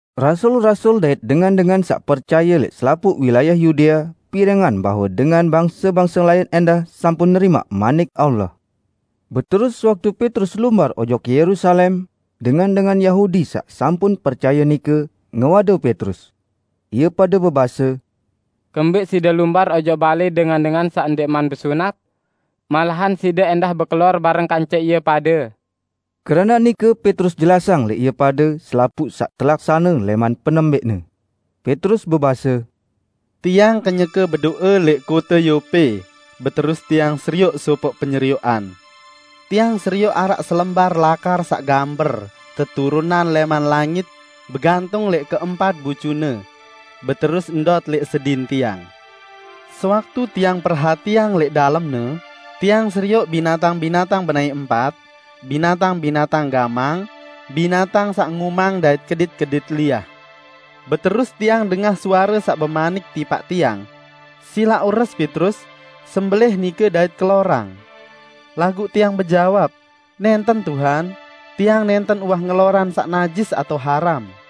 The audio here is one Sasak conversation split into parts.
Rasul-rasul dait dengan-dengan saq percaye lẽq selapuq wilayah Yudea pirengang bahwe dengan bangse-bangse lain ẽndah sampun nerimaq Manik Allah. Beterus sewaktu Petrus lumbar ojok Yerusalem, dengan-dengan Yahudi saq sampun percaye nike, ngewade Petrus. Ie pade bebase, "Kembẽq side lumbar ojok balẽ dengan-dengan saq ndẽqman besunat? Malahan side ẽndah bekelor bareng kance ie pade!" Keranaq nike Petrus jelasang lẽq ie pade selapuq saq telaksane lẽman penembẽqne. Petrus bebase, "Tiang kenyeke bedo'e lẽq kote Yope, beterus tiang serioq sopoq penyerioqan. Tiang serioq araq selembar lakar saq gamber teturunang lẽman langit, begantung lẽq keempat bucune, beterus ndot lẽq sedin tiang. Sewaktu tiang perhatiang lẽq dalemne, tiang serioq binatang-binatang benaẽ empat, binatang-binatang gamang, binatang saq ngumang dait kedit-kedit liah. Beterus tiang dengah suare saq bemanik tipaq tiang, 'Silaq ures Petrus! Sembelẽh nike dait kelorang!' Laguq tiang bejawab, 'Nẽnten Tuhan! Tiang nẽnten uwah ngelorang saq najis atao haram!'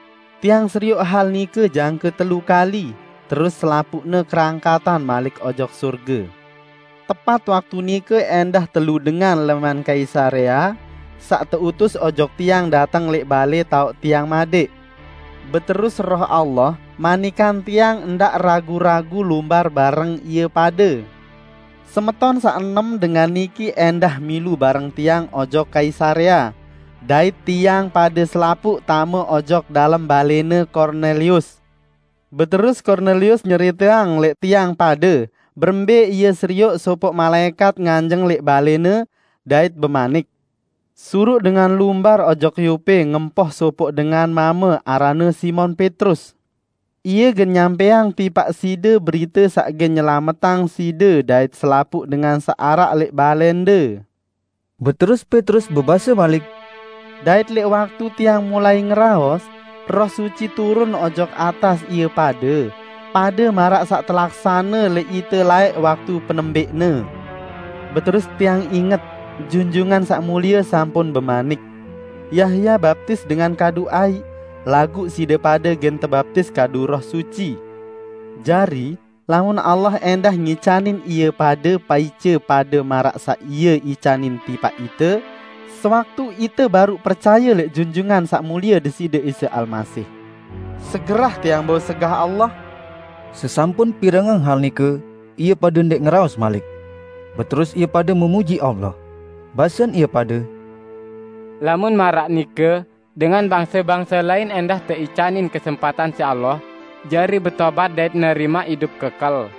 Tiang serioq hal nike jangke telu kali, terus selapuqne kerangkatan malik ojok sorge. Tepat waktu nike ẽndah telu dengan lẽman Kaisarea, saq teutus ojok tiang dateng lẽq balẽ taoq tiang madẽq. Beterus Roh Allah manikang tiang ndaq ragu-ragu lumbar bareng ie pade. Semeton saq enem dengan niki ẽndah milu bareng tiang ojok Kaisarea, dait tiang pade selapuq tame ojok dalem balẽne Kornelius. Beterus Kornelius nyeriteang lẽq tiang pade berembẽ ie serioq sopoq malaẽkat nganjeng lẽq balẽne dait bemanik, 'Suruq dengan lumbar ojok Yope ngempoh sopoq dengan mame aranne Simon Petrus. Ie gen nyampẽang tipaq side berite saq gen nyelametang side dait selapuq dengan saq araq lẽq balẽnde.' Beterus Petrus bebase malik," dait lẽq waktu tiang mulai ngeraos, "Roh Suci turun ojok atas ie pade, pade maraq saq telaksane lẽq ite laẽq waktu penembẽqne. Beterus tiang inget, Junjungan Saq Mulie sampun bemanik, 'Yahya baptis dengan kadu aiq, laguq side pade gen tebaptis kadu Roh Suci.' Jari, lamun Allah ẽndah ngicanin ie pade paice pade maraq saq Ie icanin tipaq ite sewaktu ite baruq percaye lẽq Junjungan Saq Mulie Deside Isa Almasih. Segerah tiang bau segah Allah!" Sesampun pirengang hal nike, ie pade ndẽq ngeraos malik. Beterus ie pade mulieang Allah. Basen ie pade, "Lamun maraq nike dengan bangse-bangse lain ẽndah teicanin kesempatan siq Allah jari betobat dait nerimaq idup kekel."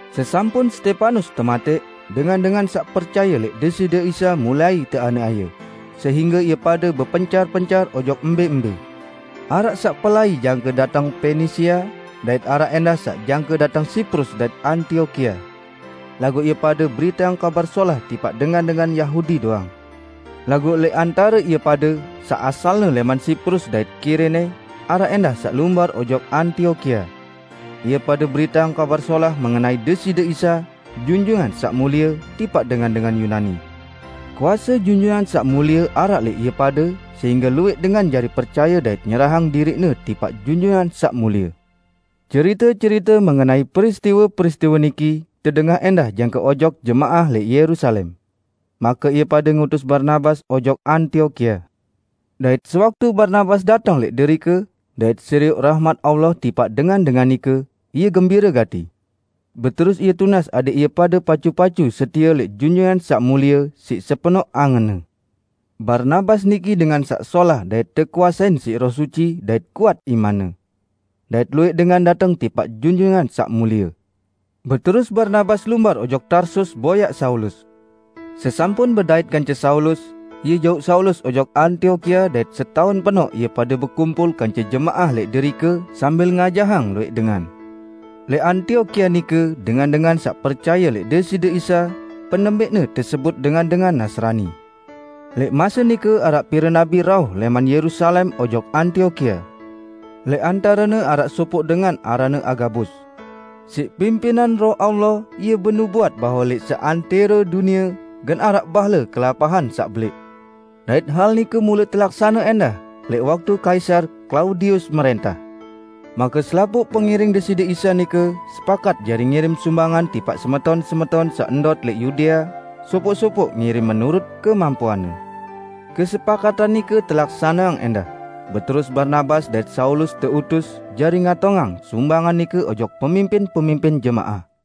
Sesampun Stepanus tematẽq, dengan-dengan saq percaye lẽq Deside Isa mulai teaniaye, sehingge ie pade bepencar-pencar ojok mbẽ-mbẽ. Araq saq pelai jangke dateng Penisia, dait araq ẽndah saq jangke dateng Siprus dait Antiokia. Laguq ie pade beriteang Kabar Solah tipaq dengan-dengan Yahudi doang. Laguq lẽq antare ie pade, saq asalne lẽman Siprus dait Kirene, araq ẽndah saq lumbar ojok Antiokia. Ie pade beriteang Kabar Solah mengenai Deside Isa, Junjungan Saq Mulie, tipaq dengan-dengan Yunani. Kuase Junjungan Saq Mulie araq lẽq ie pade sehingge luwẽq dengan jari percaye dait nyerahang diriqne tipaq Junjungan Saq Mulie. Cerite-cerite mengenai peristiwe-peristiwe niki tedengah ẽndah jangke ojok jemaah lẽq Yerusalem. Make ie pade ngutus Barnabas ojok Antiokia. Dait sewaktu Barnabas dateng lẽq derike, dait serioq rahmat Allah tipaq dengan-dengan nike, ie gembire gati. Beterus ie tunas adẽq ie pade pacu-pacu setie lẽq Junjungan Saq Mulie siq sepenoq angenne. Barnabas niki dengan saq solah dait tekuasein siq Roh Suci dait kuat imanne. Dait luwẽq dengan dateng tipaq Junjungan Saq Mulie. Beterus Barnabas lumbar ojok Tarsus boyaq Saulus. Sesampun bedait kance Saulus, ie jauq Saulus ojok Antiokia dait setaun penoq ie pade bekumpul kance jemaah lẽq derike sambil ngajahang luwẽq dengan. Lẽq Antiokia nike dengan-dengan saq percaye lẽq Deside Isa penembẽqne tesebut dengan-dengan Nasrani. Lẽq mase nike araq pire nabi rauh lẽman Yerusalem ojok Antiokia. Lẽq antarene araq sopoq dengan aranne Agabus. Siq pimpinan Roh Allah ie benubuat bahwe lẽq seantẽro dunie gen araq bahle kelapahan saq belẽq. (Dait hal nike mule telaksane ẽndah lẽq waktu Kaisar Klaudius mrẽntah.) Make selapuq pengiring Deside Isa nike sepakat jari ngirim sumbangan tipaq semeton-semeton saq ndot lẽq Yudea; sopoq-sopoq ngirim menurut kemampuanne. Kesepakatan nike telaksaneang ẽndah, beterus Barnabas dait Saulus teutus jari ngatongang sumbangan nike ojok pemimpin-pemimpin jemaah.